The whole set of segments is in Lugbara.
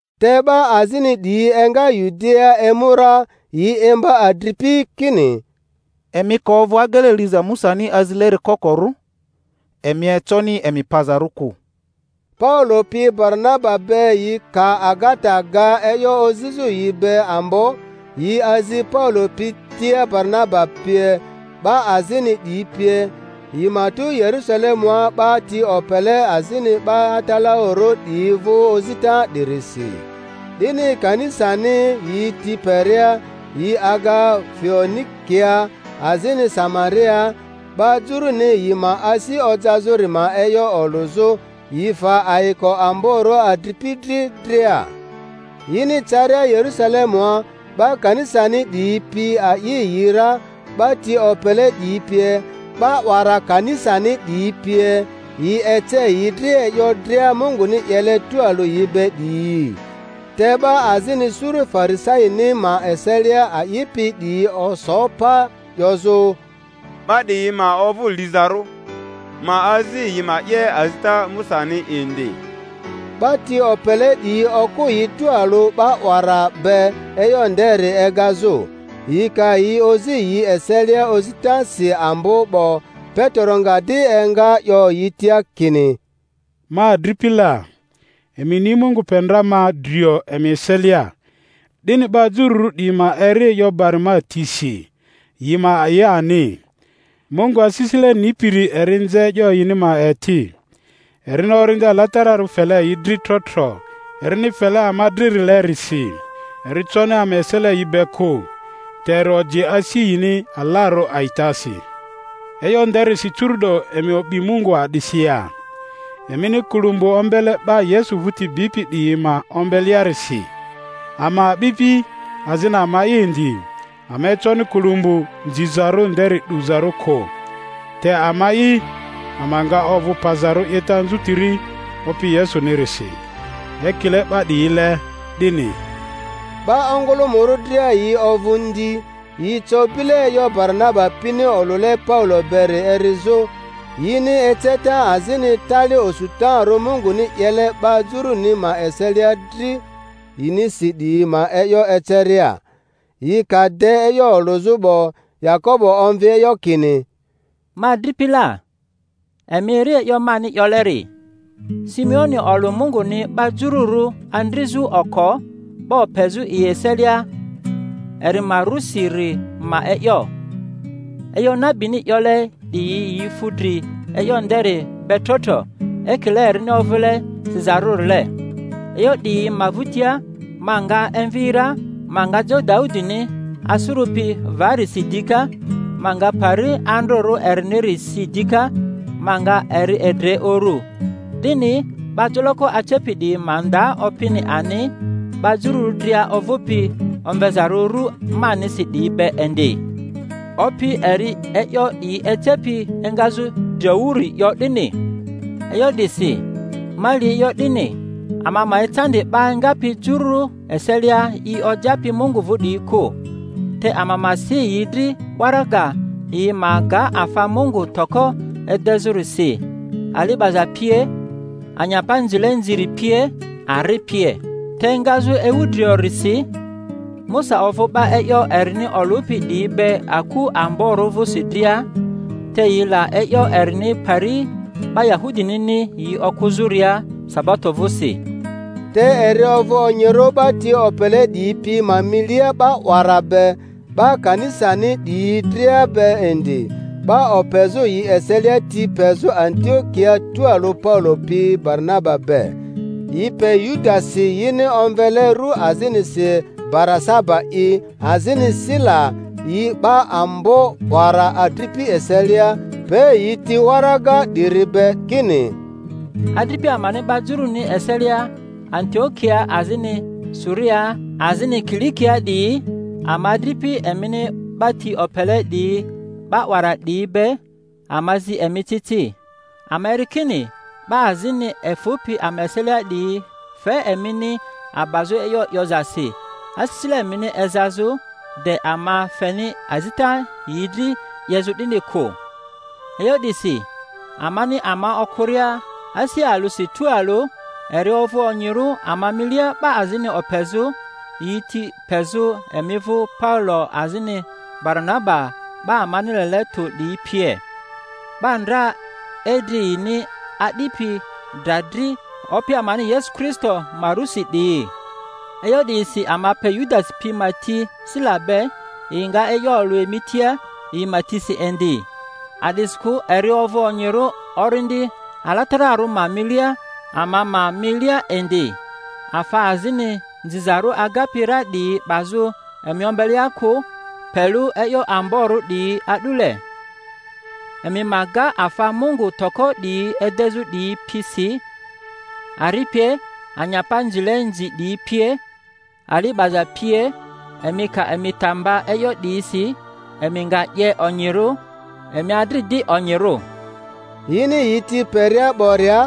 Te 'ba azini 'diyi enga Yudiaa emu ra, yi imba adripi kini, Emi ka ovᴜ agele liza Musani azileri kokorᴜ, emi econi emi pazarᴜ kᴜ. Paulo pi Baranaba be yi ka agata ga e'yo ozizᴜ yi be ambo, yi azi Paulo pi tia Baranaba pie, 'ba azini 'diyi pie, yi ma tu Yerusalemua 'ba ti opele azini 'ba atalaᴜrᴜ 'diyi vᴜ ozita 'dirisi. 'Dini kanisani yi ti peria, yi aga Foenikia azini Samariaa, 'ba Juruni yi ma asi ojazᴜri ma e'yo olᴜzᴜ; yi fe ayiko amborᴜ adripi dri dria. Yini caria Yerᴜsalemua, 'ba kanisani 'diyi pi a'i yi ra, 'ba ti opele 'diyi pie, 'ba 'wara kanisani 'diyi pie; yi ece yi dri e'yo dria Munguni 'yele tualᴜ yi be 'diyi. Te 'ba azini suru Farisaini ma eselia a'ipi 'diyi oso pa, 'yozᴜ, 'Ba 'diyi ma ovᴜ lizarᴜ, ma azi yi ma 'ye azita Musani indi. 'Ba ti opele 'diyi okᴜ yi tualᴜ 'ba 'wara be e'yo nderi egazᴜ. Yi ka yi ozi yi eselia ozitasi ambo 'bo, Petero nga di enga 'yo yi tia kini, Ma adripi la, emi ni Mungu pe ndra ma drio emi eselia, 'dini 'ba Jururᴜ 'diyi ma eri e'yo bari ma tisi, yi ma a'i ani. Mungu asisile nipiri eri nze e'yo yini ma eti, erini Orindi Alatararᴜ fele yi dri tro tro erini fele ama dririlerisi; eri coni ama esele yi be kᴜ. te eri oji asi yini alarᴜ a'itasi. E'yo nderisi curu'do emi o'bi Mungu a'disi ya, emini kulumgbu ombele 'ba Yesu vᴜti bipi 'diyi ma ombelearisi? Ama a'bipi azini ama'i indi, ama econi kulumgbu nzizarᴜ nderi 'duzarᴜ kᴜ. Te ama a'i ama nga ovᴜ pazarᴜ 'yeta anzutiri Opi Yesunirisi, ekile 'ba 'diyile 'dini. 'Ba ongᴜlᴜmᴜrᴜ dria yi ovᴜ ndi; yi co bile e'yo Baranaba pini olᴜle Paulo beri erizᴜ, yini eceta azini tali osutarᴜ Munguni 'yele 'ba Juruni ma eselia dri yinisi 'diyi ma e'yo eceria. Yi ka de e'yo olᴜzᴜ 'bo, Yakobo omvi e'yo kini, Ma adripi la, emi eri e'yo mani 'yoleri. Simeoni olᴜ Munguni 'ba Jururᴜ andrizᴜ oko 'ba opezᴜ yi eselia eri ma rusiri ma e'yo. E'yo nabini 'yole 'diyi yi fu dri e'yo nderi be tro-tro, ekile erini ovᴜle sizarᴜrile, E'yo 'diyi ma vᴜtia ma nga emvi ra, ma nga jo Daudini asᴜrᴜpi vari si dika; ma nga pari andrᴜrᴜ eriniri si dika, ma nga eri edre urᴜ, 'dini 'ba joloko acepi 'diyi ma nda Opini ani, 'ba Jururᴜ dria ovᴜpi omvezarᴜ rᴜ manisi 'diyi be indi, Opi, eri'i e'yo 'diyi ecepi engazᴜ driowuri, 'yo 'dini. E'yo 'disi ma li e'yo 'dini, ama ma ecandi 'ba engapi Juru eselia yi ojapi Mungu vᴜ 'diyi kᴜ, te ama ma si yi dri waraga, yi ma ga afa mungu toko edezᴜri si, ali 'baza pie, anyapa nzile nziri pie, ari pie. Te engazᴜ ewu driorisi Musa ovᴜ 'ba e'yo erini olᴜpi 'diyi be aku amborᴜ vᴜsi dria, te yi la e'yo erini pari 'ba Yahudinini yi okᴜzᴜria sabato vᴜsi. Te eri ovᴜ onyirᴜ 'ba ti opele 'diyi pi ma milia 'ba 'wara be, 'ba kanisani 'diyi dria be indi, 'ba opezᴜ yi eselia ti pezᴜ Antiokiaa tualᴜ Paulo pi Baranaba be. Yi pe Yudasi yini omvele ru azinisi Barasaba'i, azini Sila, yi 'ba ambo 'wara adripi eselia; pe yi ti waraga 'diri be kini: Adripi amani 'ba Juruni eselia Antiokiaa, azini Suriaa.. azini Kilikiaa 'diyi, ama adripi emini 'ba ti opele ''diyi 'ba 'wara 'diyi be, ama zi emi ci ci. Ama eri kini 'ba azini efᴜpi ama eselia 'diyi fe emini abazᴜ e'yo 'yozasi, asisile emini ezazᴜ, de ama feni azita yi dri 'yezᴜ 'dini kᴜ. E'yo 'disi amani ama okᴜria asi alᴜsi tualᴜ, eri ovᴜ onyirᴜ ama milia 'ba azini opezᴜ, yi ti pezᴜ emi vᴜ Paulo azini Baranaba 'ba amani lele tᴜ 'diyi pie, 'ba ndra idri yini adipi dra dri Opi amani Yesu Kristo ma rusi 'diyi. E'yo 'diyisi ama pe Yudasi pi ma ti Sila be, yi nga e'yo olᴜ emi tia yi ma tisi indi. A'disikᴜ eri ovᴜ onyirᴜ Orindi Alatararᴜ ma milia, ama ma milia indi, afa azini nzizarᴜ agapi ra 'diyi 'bazᴜ emi ombelea kᴜ, pe lᴜ e'yo amborᴜ 'diyi a'dule: emi ma ga afa mungu toko 'diyi edezᴜ 'diyi pi si, ari pie, anyapa nzile nzi 'diyi pie, ali 'baza pie. Emi ka emi ta mba e'yo 'diyisi, emi nga 'ye onyirᴜ. Emi adri di onyirᴜ. Yini yi ti peria 'boria,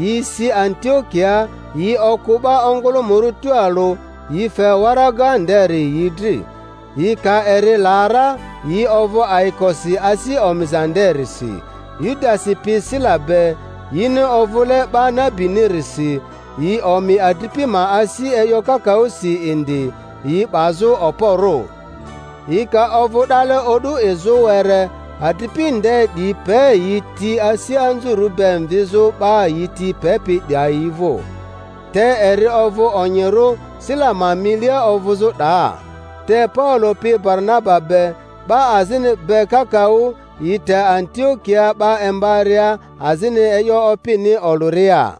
yi si Antiokiaa; yi okᴜ 'ba ongᴜlᴜmᴜrᴜ tualᴜ, yi fe waraga nderi yi dri. Yi ka eri la ra yi ovᴜ ayikosi asi omiza nderisi. Yudasi pi Sila be, yini ovᴜle 'ba nabinirisi, yi omi adripi ma asi e'yo kakaᴜsi indi, yi 'bazᴜ okporᴜ. Yi ka ovᴜ 'dale o'du izᴜ were, adripi nde 'diyi pe yi ti asi anzurᴜ be mvizᴜ 'ba yi ti pepi 'dayi vᴜ. Te eri ovᴜ onyirᴜ Sila ma milia ovᴜzᴜ 'daa. Te Paulo pi Baranaba be, 'ba azini be kakaᴜ, yi te Antiokiaa 'ba imbaria azini e'yo Opini olᴜria.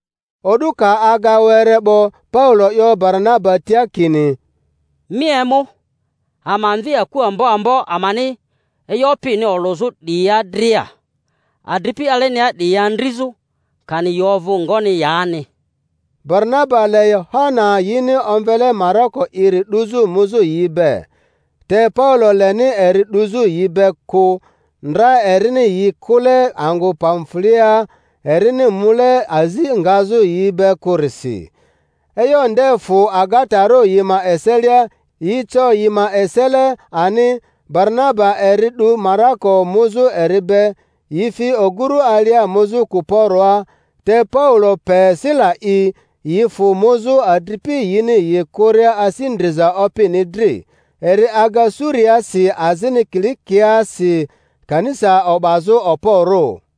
O'du ka aga were 'bo Paulo 'yo Baranaba tia kini, Mi emu, ama mvi aku ambo ambo amani e'yo Opini olᴜzᴜ 'diyia dria, adripi alenia 'diyi andrizᴜ, kani yi ovᴜ ngoni yani. Baranaba le Yohana yini omvele Marako'iri 'duzᴜ muzᴜ yi be. Te Paulo leni eri 'duzᴜ yi be kᴜ, ndra erini yi kᴜle angᴜ Pamfuliaa, erini mule azi ngazᴜ yi be kᴜrisi. E'yo nde fᴜ agatarᴜ yi ma eselia, yi co yi ma esele ani; Baranaba eri 'du Marako muzᴜ eri be, yi fi ogᴜru alia muzᴜ Kuporoa, te Paulo pe Sila'i, yi fᴜ muzᴜ, adripi yini yi kᴜria asi ndriza Opini dri. Eri aga Suriaasi azini Kilikiaasi, kanisa o'bazᴜ okporᴜ.